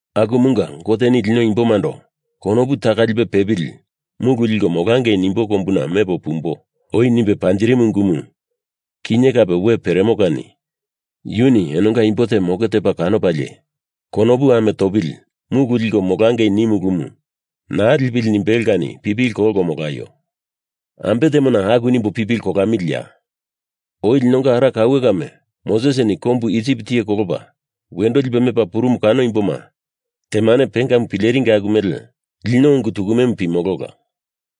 Akumunga Goteni lino imbomando konopu taka lipe pepili mulu liko molangei nimbo kombuna mepo pumbo oi nimbe panjirimu ungumu, kinye kape we peremo kani yuni enonga imbo te moke tepa kanopalie konopu ame topili mulu liko molangei niu ulumu naa lipili nimbelo kani pipili kolko molaio. Ambe temona aku nimbo pipili kolamiliya? Oi linonga ara kaue kame Mosesini kombu Isip tiye kolopa wendo lipe mepa purumu kano imboma temane pengamu pileringi, aku mele lino ungu tukumemu pimolola.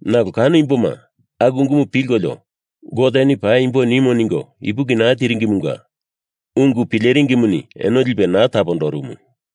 Nalo kano imboma aku ungumu pilkolio Goteni paimbo nimo ningo ipuki naa tiringimunga ungu pileringimuni eno lipe naa tapondorumu.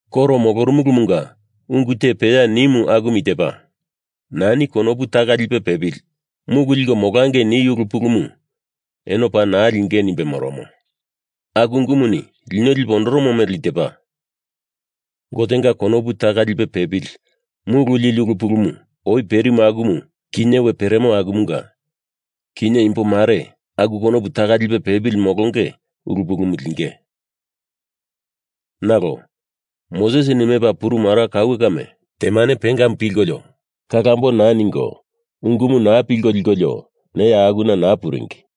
Koro molorumumunga ungu te peya nimu akumu i tepa: Nani konopu taka lipe pepili mulu liko molangei niu ulu pulumu eno paa naa linge nimbe moromo. Aku ungumuni lino lipe ondoromo mele i tepa: Gotenga konopu taka lipe pepili mulu lili ulu pulu oi perimu akumu kinye we peremo akumunga kinye imbo mare aku konopu taka lipe pepili molonge ulu pulumu linge. Nalo Mosesini mepa purumu ara kaue kame temane pengamu pilkolio kalambo naa ningo ungumu naa pilko likolio neya akuna naa puringi.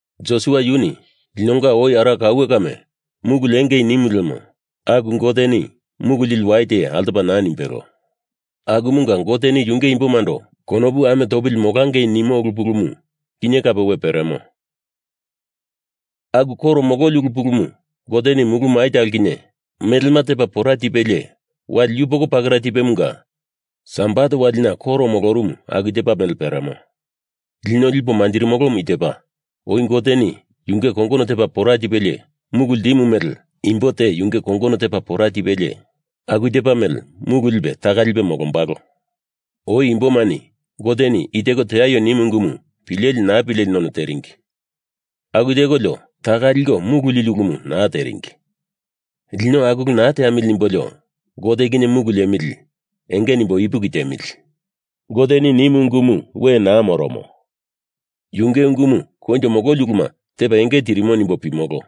Josua yuni linonga oi ara kaue kame mulu liengei nimu lemo aku Goteni mulu lili wai te altopa naa nimbelo. Akumunga Goteni yunge imbomando konopu ame topili molangei nimo ulu pulumu kinye kape we peremo. Aku koro mololi ulu pulumu Goteni mulu mai talo kinye melema tepa pora tipelie, wali yupoko pakera tipemunga Sabat walina koro molorumu aku tepa mele peremo. Lino lipo manjirimolomu i tepa, oi Goteni yunge kongono tepa pora tipelie mulu ltimu mele imbo te yunge kongono tepa pora tipelie aku tepa mele mulu lipe taka lipe molombalo. Oi imbomani Goteni i teko teaio nimu ungumu pileli naa pileli none teringi. Aku tekolio taka liko mulu lili ulumu naa teringi. Lino aku ulu naa teamili nimbolio Gote kinye mulu liemili enge nimbo ipuki tiemili. Goteni nimu ungumu we naa moromo. Yunge ungumu koinjo mololi uluma tepa enge tirimo nimbo pimolo.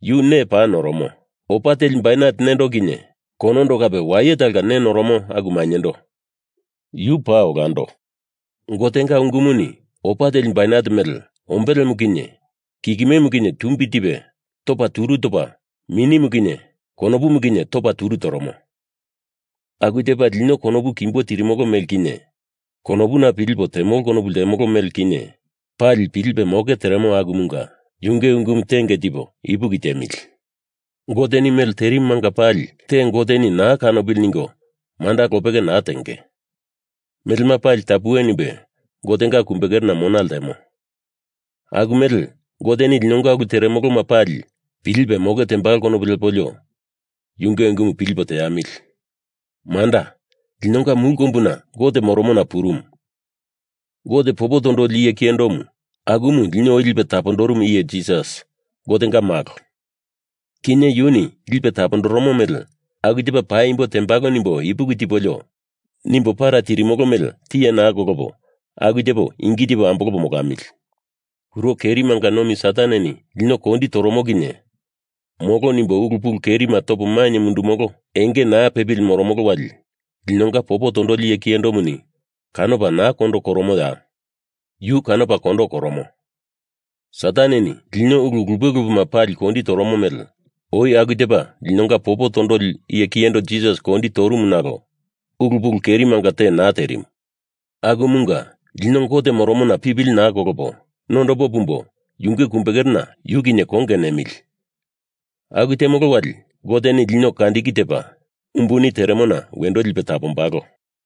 Yu nee paa noromo, opa teli bainet nendo kinye konondo kape waye talonga nee noromo aku mainyendo, yu paa olando. Gotenga ungumuni opa teli bainet mele ombelemu kinye kikimemu kinye tumbi tipe topa turu topa minimu kinye konopumu kinye topa turu toromo. Aku tepa lino konopu kimbo tirimolo mele kinye, konopuna pilipo temolo konopu ltemolo mele kinye, pali pilipe moke teremo akumunga yunge ungumu tenge tipo ipuki tiemili. Goteni mele terimumanga pali te Goteni naa kanopili ningo manda lopeke naa tenge. Melema pali tapuwe nimbe Gotenga kumbekerena mona ltemo. Aku mele Goteni linonga ulu teremoloma pali pilipe moke tembalo konopu lepolio yunge ungumu pilipo teamili. Manda, linonga mulu kombuna Gote moromona purumu Gote popo tondoli iye kiyendo, akumu lino oi lipe tapondorumu iye Jisas, Gotenga Malo. Kinye yuni lipe tapondoromo mele aku tepa paimbo tembalo nimbo ipuki tipolio nimbo para tirimolo mele tiye naa kolopo aku tepo ingi tipo ambolopo molamili. Kuro kerimanga nomi Sataneni lino kondi toromo kinye molo nimbo ulu pulu kerima topo mainye mundumolo enge naa pepili moromolo wali linonga popo tondoli iye kiyendomuni kanopa naa kondo koromoya? Yu kanopa kondo koromo. Sataneni lino ulu lupe lupema pali kondi toromo mele oi aku tepa linonga popo tondoli iye kiyendo Jisas kondi torumu nalo ulu pulu kerimanga te naa terimu. Akumunga, lino Gote moromona pipili naa kolopo nondopo pumbo yunge kumbekerena yu kinye konge nemili. Aku temolo wali Goteni lino kandiki tepa umbuni teremona wendo lipe tapombalo.